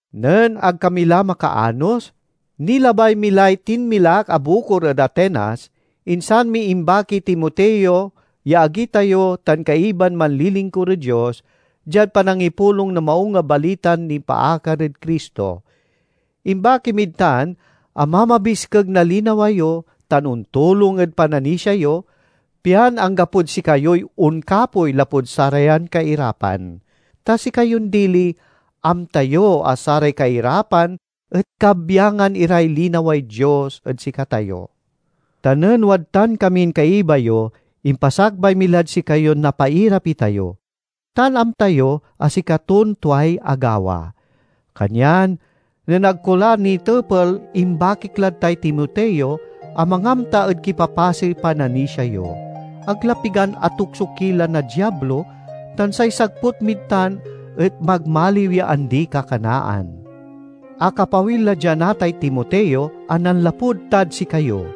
Nen ag kami la makaanos, nilabay mi lay tinmilak a bukor ed Atenas, insan mi imbakiy Timoteo ya agi tayo tan kaiban manlilingkur ed Dios diad panangipulong na Maung a Balitan nipaakar ed Cristo. Imbaki mid tan a mamabiskeg na linawa yo tan ontulong ed pananisia yo, pian anggapod sikayoy onkapoy lapud sarayan kairapan. Ta sikayon dili, amta yo a saray kairapan et kabyangan iray linaway Dios ed sikatayo. Ta nen wadtan kamin kaiba yo impasakbay mi lad sikayon napairap itayo—tan amta yo a sikaton tuay agawa. Kanyan nen ag ko la nitepel imbakik lad tay Timoteo a mangamta ed kipapasey pananisia yo. Ag la pigan atukso ki la na Diablo tan say sagput mid tan et magmaliw ya andi-kakanaan. Akapawil la dia natay Timoteo a nanlapud tad sikayo.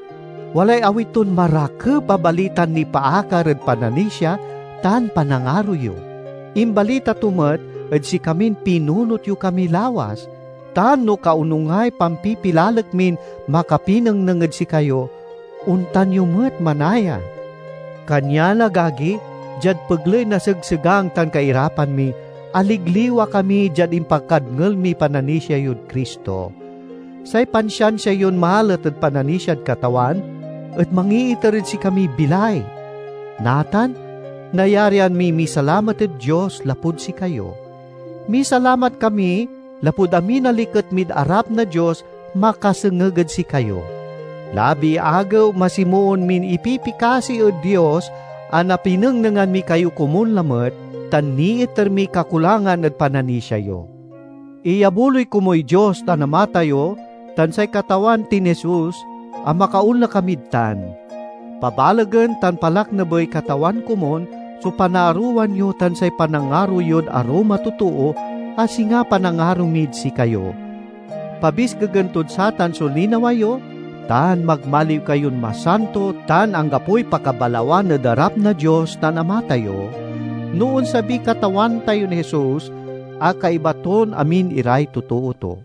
Walay awit ton marakep a balitan nipaakar ed pananisia tan panangaro yo. Imbalita to met ed sikamin pinunot yo kami lawas, tan no kaonungay pampipilalek min makapinengneng ed sikayo, ontan yo met manaya. Kanyan, agagi, diad pegley na segsegang tan kairapan mi, aligliwa kami diad impakadngel miy pananisia yod Cristo. Say pansiansia yon malet ed pananisiad Katawan et mangiiter ed sikamiy bilay. Natan nayarian miy misalamat ed Dios lapud sikayo. Misalamat kami lapud amin a liket mid arap na Dios makasengeg ed sikayo. Labi-agew masimoon min ipipikasi ed Dios a napinengnengan mi kayo komun lamet tan niiter miy kakulangan ed pananisia yo. Iyabuloy komuy Dios tan Ama tayo tan say Katawan tin Jesus, a makaonla kamid tan. Pabalegen tan palaknabey Katawan komun so panaarowan yo tan say panangaro yod arum a totoo, a singa panangaro mid sikayo. Pabiskegen tod satan so linawa yo, tan magmaliw kayon masanto tan anggapoy pakabalawan ed arap na Dios tan Ama tayo, no onsabiy Katawan tayon Jesus a kaiba ton amin iray totoo to.